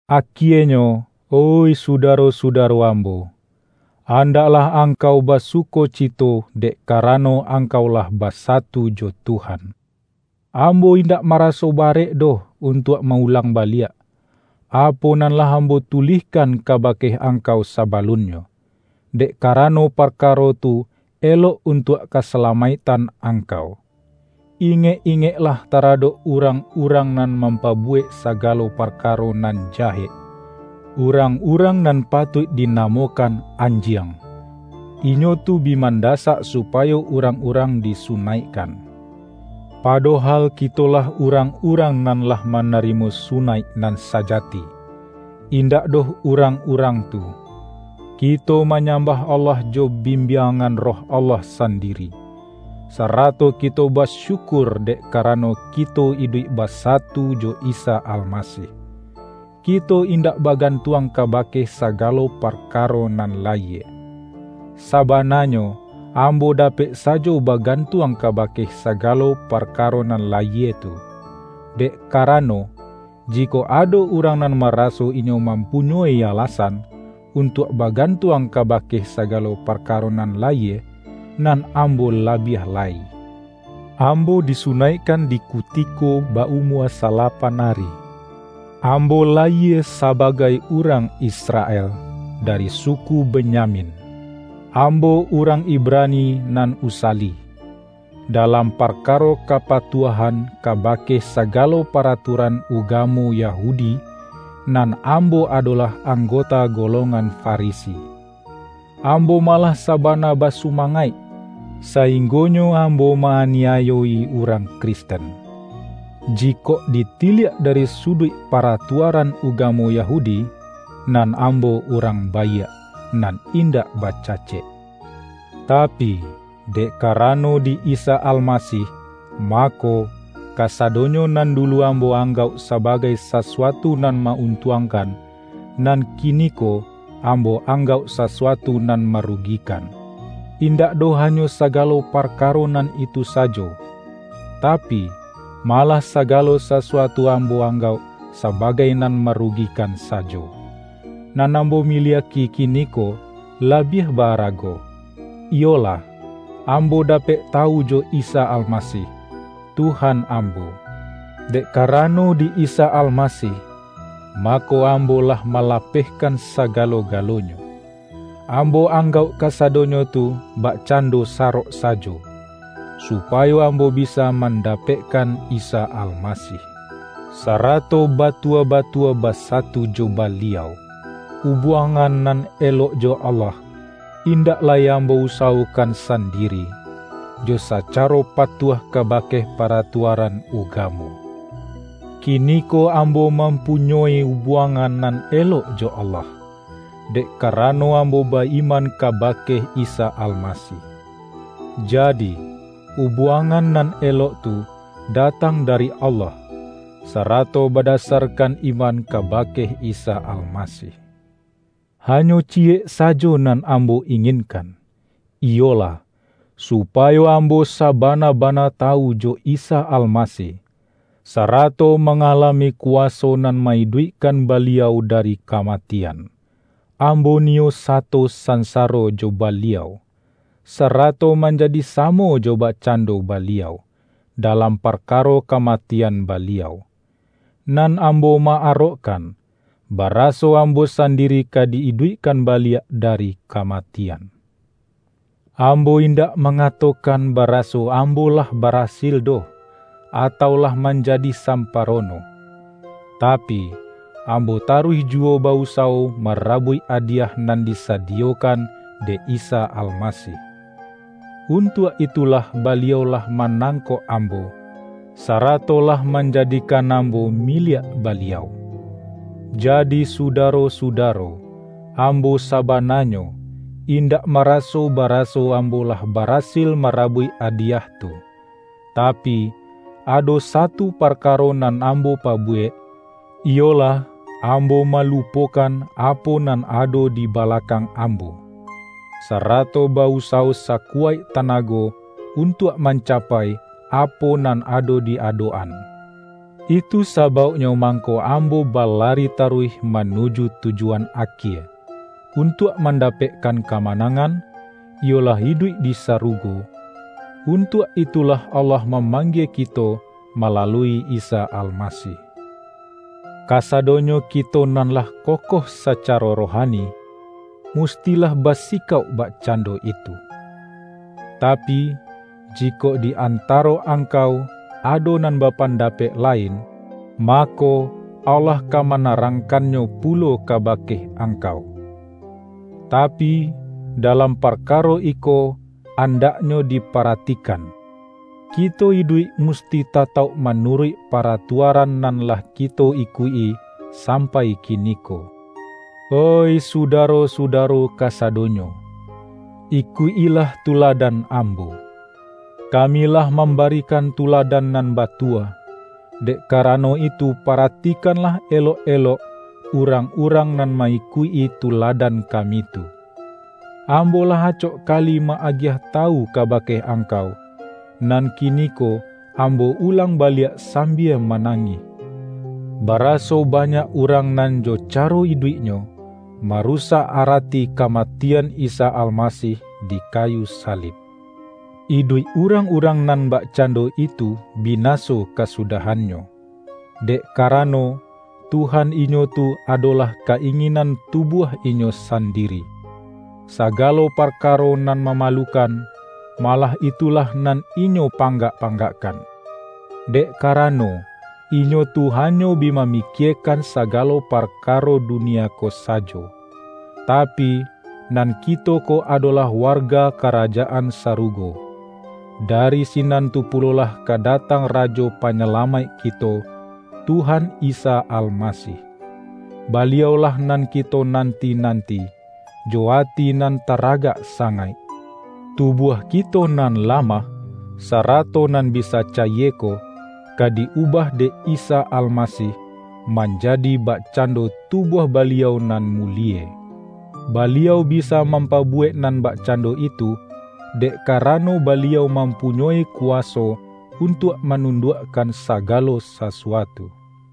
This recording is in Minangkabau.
Akienyo, oih sudaro-sudaro ambo, andaklah angkau basukocito dek karano angkau lah basatu jo Tuhan. Ambo indak maraso barek doh untuak ma-ulang baliak, apo nan lah ambo tu-lihkan kabake angkau sabalunnyo; dek karano parkaro tu elok untuak kasala-maiktan angkau. Ingek-ingeklah ta-radok urang-urang nan mampabuwek sagalo parkaro nan jahek, urang-urang nan patuik dinamokan ’anjiang'. Inyo tu bi mandasak supayo urang-urang di-sunaikkan. Padohal kitolah urang-urang nan lah manarimo sunaik nan sajati, indak doh urang-urang tu. Kito manyambah Allah jo bimbiangan Roh Allah sandiri, sarato kito basyukur dek karano kito iduik basatu jo Isa Almasih. Kito indak bagantuang kabake sagalo parkaro nan layie. Sabananyo ambo dapek sajo bagantuang kabake sagalo parkaro nan layie tu. Dek karano, jikok ado urang nan maraso inyo mampu-nyoi alasan, untuak bagantuang kaba-ke sagalo parkaro nan layie, nan am-bo labiah lai. Ambo disunaikkan di kutiko ba-umua salapan ari. Ambo la-yie sabagai urang Israel, dari suku Be-nyamin; ambo urang Ibrani nan usa-li. Dalam parkaro kapatuahan kabake sagalo paratuaran ugamo Yahudi, nan ambo adolah anggota golongan Fari-si. Ambo malah sabana basumangaik, sainggonyo ambo ma-aniayo-i urang Kristen. Jikok ditiliak dari suduik pa-ratuaran ugamo Yahudi, nan ambo urang baiak nan indak bacacek. Tapi, dek karano di Isa Almasih, mako, kasa-donyo nan dulu ambo anggauk sabagai sasuatu nan ma-untuangkan, nan kini-ko ambo anggauk sasuatu nan marugi-kan. Indak doh hanyo sagalo parkaro nan itu sajo; tapi, malah sagalo sasu-atu ambo anggauk sabagai nan maru-gikan sajo. Nan ambo miliak-i kiniko labiah ba-arago: iyolah, ambo dapek tawu jo Isa Almasih, Tuhan ambo. Dek karano di Isa Almasih, mako, ambo lah malapehkan sagalo-galonyo. Am-bo anggauk kasadonyo tu bakcando sa-rok sajo, supayo ambo bisa mandapek-kan Isa Almasih, sarato batua-batua basatu jo Baliau. Ubuangan nan elok jo Allah, indak lai ambo usawokan san-diri, jo sacaro patuah kabake paratua-ran ugamo. Kiniko ambo mampunyoi ubuangan nan elok jo Allah, dek kara-no ambo ba-iman kabake Isa Almasih. Jadi, ubuangan nan elok tu datang da-ri Allah, sarato badasarkan iman kaba-ke Isa Almasih. Hanyo ciyek sajo nan ambo inginkan, iyolah, supayo ambo sabana-bana tawu jo Isa Almasih, sa-rato mangalami kuwaso nan ma-iduik-kan Baliau dari kamatian. Ambo niyo sato sansaro jo Baliau, sarato manjadi samo jo bakcando Baliau, dalam parka-ro kamatian Baliau. Nan ambo ma-arokkan, baraso ambo sandiri ka di-iduikkan baliak dari kamatian. Ambo indak mangatokan baraso ambo lah barasil doh, atau lah manjadi samparono. Tapi, ambo taruih juwo ba-usawo marabuik adiyah nan disadiyokan dek Isa Almasih. Untuak itulah Baliau lah manangkok ambo, sarato lah manjadikan ambo miliak Baliau. Jadi sudaro-sudaro, am-bo sabananyo, indak maraso bara-so ambo lah barasil marabuik adiyah tu. Tapi, ado satu parkaro nan am-bo pabuwek, iyolah, ambo malupo-kan apo nan ado di balakang ambo, sarato ba-usawo sakuwaik tanago un-tuak mancapai apo nan ado di adok-an. Itu sabauknyo mangko ambo balari taruih manuju tujuan akie, untuak mandapekkan kamanangan, iyolah iduik di sarugo; untuak itulah Allah mamanggie kito malalui Isa Almasih. Kasadonyo kito nan lah kokoh sa-caro rohani, mustilah basikauk bak-cando itu. Tapi, jikok di antaro ang-kau ado nan bapandapek lain, mako, Allah ka manarangkannyo pulo ka-bake angkau. Tapi, dalam parkaro iko andaknyo diparatikan: Kito iduik musti tatauk manuruik paratuaran nan lah kito ikuik-i sampai kiniko. Oih sudaro-sudaro kasadonyo! Ikuik-ilah tuladan ambo. Kami lah mambarikan tuladan nan batua, dek karano itu paratikanlah elok-elok, urang-urang nan ma-ikuik-i tuladan kami tu. Ambo lah acok kali ma-agiah tawu kabake angkau, nan ki-niko ambo ulang baliak sambia ma-nangih, baraso banyak urang nan jo caro iduiknyo, marusak arati kamati-an Isa Almasih di kayu salib. Iduik urang-urang nan bakcando itu bina-so kasudahannyo, dek karano, Tuhan inyo tu adolah ka-inginan tubuah inyo sandiri. Sagalo parkaro nan mamalukan, malah itulah nan inyo panggak-panggakkan; dek karano, inyo tu hanyo bi mamikiekan saga-lo parkaro dunia ko sajo. Tapi, nan kito ko adolah warga karajaan sarugo. Dari sinan tu pulolah ka datang Rajo Panyalamaik kito, Tuhan Isa Almasih. Baliau-lah nan kito nan-ti-nanti, jo ati nan taragak sangaik. Tubuah kito nan lamah, sarato nan bisa cayie ko, ka di-ubah dek Isa Almasih, manjadi bakcando tubuah Baliau nan mulie. Baliau bisa mam-pabuwek nan bakcando itu, dek ka-rano Baliau mampunyoi kuwaso un-tuak manunduakkan sagalo sasuatu.